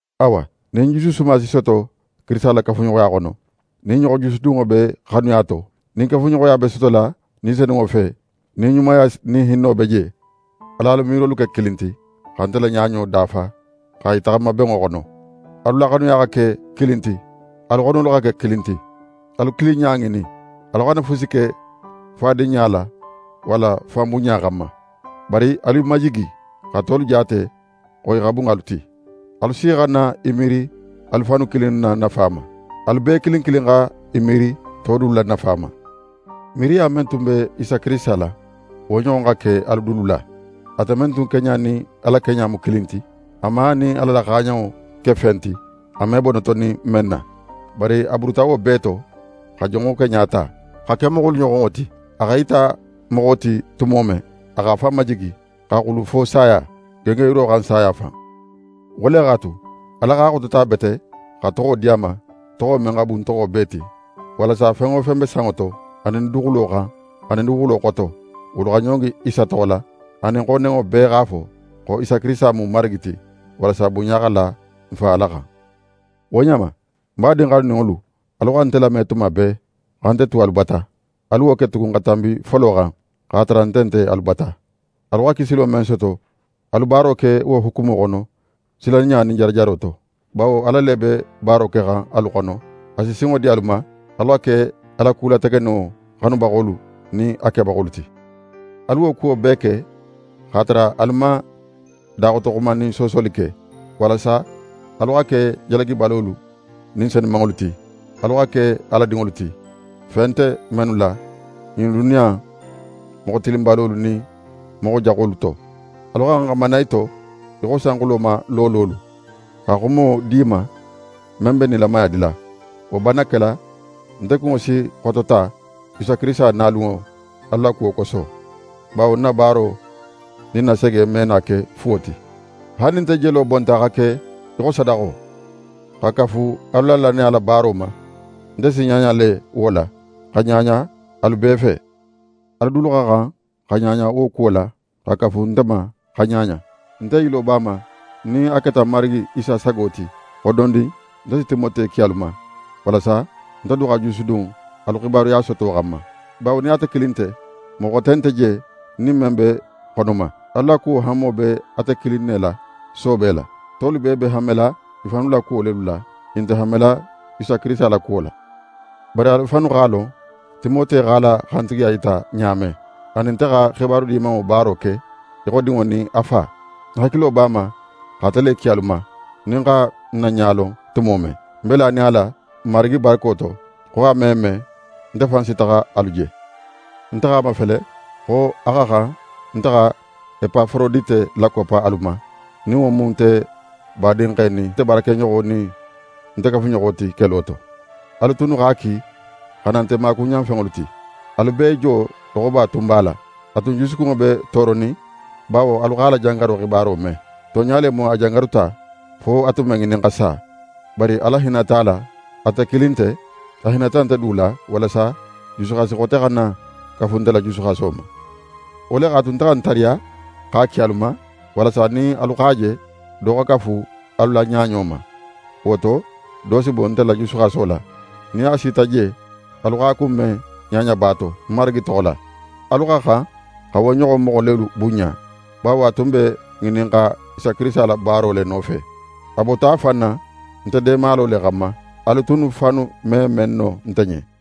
Awa, nin jusu suma si soto Kirisita la kafuɲoxoya xono, nin ɲoxo jusudunŋo be xanuya to, nin kafuɲoxoya be sotola Ni Senunŋo fe, nin ɲumaya nin hinno be je, al'alu miirolu ke kilin ti, xa nte la ɲaɲo dafa, xa i taxama benŋo xono. Alu la xanuya xa ke kilin ti, alu xonolu xa ke kilin ti, alu kilinɲa ŋinin. Alu xana fusi ke fadinɲa la walla fanbunɲa xanma. Bari alu i majigi, xa tolu jaate xo i xa bun alu ti. Alu si xana í miiri alu fannu kilinnu la nafa ma, alu bee kilin kilin xa í miiri to dulu la nafa ma. Miiriya men tun be Isa Kirisita la, wo ɲoxon xa ke alu dulu la: Ate men tun keɲa nin Ala keɲa mu kilin ti, a man a nin Ala la xaaɲanŋo ke fen ti, a me bo notonin men na. Bari a buruta wo bee to, xa jonŋo keɲa ta, xa ke moxolu ɲoxonŋo ti. A x'é yita moxo ti tumo men, a x'a fan majigi, xa xulu fo saya, gengenyiro xan saya fan. Wo le x'a tu, Ala x'a xotota bete, xa toxo di a ma, toxo men xa bun toxo bee ti, walasa fen wo fen be sanŋo to, anin duguxulo xan, anin duguxulo xoto, wolu ɲongi Isa toxo la; anin xo nenŋo bee x'a fo xo Isa Kirisita mu Marigi ti, walasa bunɲa xa la n Fa Ala xan. Wo ɲa ma, ń badin xanuninŋolu, alu xa nte lame tuma bee, xa nte tu alu bata. Alu wo ke tugun xa tanbi folo xan, x'a tara nte nte alu bata. Alu xa kisilo men soto, alu baaro ke wo hukumo xono, silanɲa nin jarajaro to. Bawo Ala le be baaro kexan alu xono, a si sinŋo di alu ma, alu xa ke a la ku lategeninŋo xanubaxolu nin a kebaxolu ti. Alu kuwo bee ke x'a tara alu man daxotoxuma nin soosoli ke, walasa alu xa ke jalagibalolu nin senumanŋolu ti, alu xa ke Ala dinŋolu ti, fe nte mennu la ɲin duniya in moxo tilinbalolu nin moxo jaxu innu to. Alu xa xan xa mana i to í xo sanxulo ma loololu, xa xumo di i ma men be nilamaya dila. Wo banna kela, nte kunŋo si xotota Isa Kirisita nalunŋo alu la kuwo koso, bawo ń na baaro nin ń na sege me na ke fuwo ti. Haali nin nte jelo bonta xa ke í xo sadaxo, xa kafu alu la lannaya la baaro ma, nte si ɲaɲa le wo la, xa ɲaɲa alu bee fe. Alu dulu xa xan xa ɲaɲa wo kuwo la, xa kafu nte ma xa ɲaɲa. Nte yilo b'a ma, nin a keta Marigi Isa sago ti, xo dondin nte si Timote ki alu ma; walasa nte du xa jusudun alu xibaruya soto xanma. Bawo nin ate kilin nte, moxo xote nte je, ń nin men be xono ma. Alu la kuwo hanmo be ate kilin ne la soobe la. Tolu bee be hanmela i fannu la kuwo lelu la, i nte hanmela Isa Kirisita la kuwo la. Bari alu fannu x'a lon Timote x'a la xantigiya yita ɲa men: A nin nte xa xibaru Dimanŋo baaro ke, í xo dinŋo nin a fa. Ń hakilo b'a ma x'ate le ki alu ma, nin ń xa ń na ɲa lon tumo men. Nte be lanin a la Marigi barako to, xo a me me, nte fan si taxa alu je. Nte x'a mafele xo a xa xan nte xa Epaforodite lakoppa alu ma, nin wo mu nte badinxe nin nte baarakeɲoxo nin nte kafuɲoxo ti kelo to. Alu tunnu x'a ki xa na nte maakuɲanfenŋolu ti. Alu bee jo loxoba tun b'a la. A tun jusukunŋo be tooronin bawo alu x'a la jangaro xibaro me. Tonɲa le mu a jangaruta, fo a tun be ŋinin xa sa. Bari Ala hinnata a la, ate kilin nte, a hinnata nte du la, walasa jusuxasi xote xana kafu nte la jusuxaso ma. Wo le x'a tu, nte xa ń tariya x'a ki alu ma, walasa nin alu x'a je, do xa kafu alu la ɲaɲo ma. Wo to, do si bo nte la jusuxaso la. Nin a sita je, alu x'a kunben ɲaɲaba to, Marigi toxo la. Alu xa xan xa wo ɲoxon moxo lelu bunɲa, bawo a tun be ŋinin xa sa Kirisita la baaro le nofe. A bota a fan na nte deemalo le xanma, alu tunnu fannu me men no nte ɲen.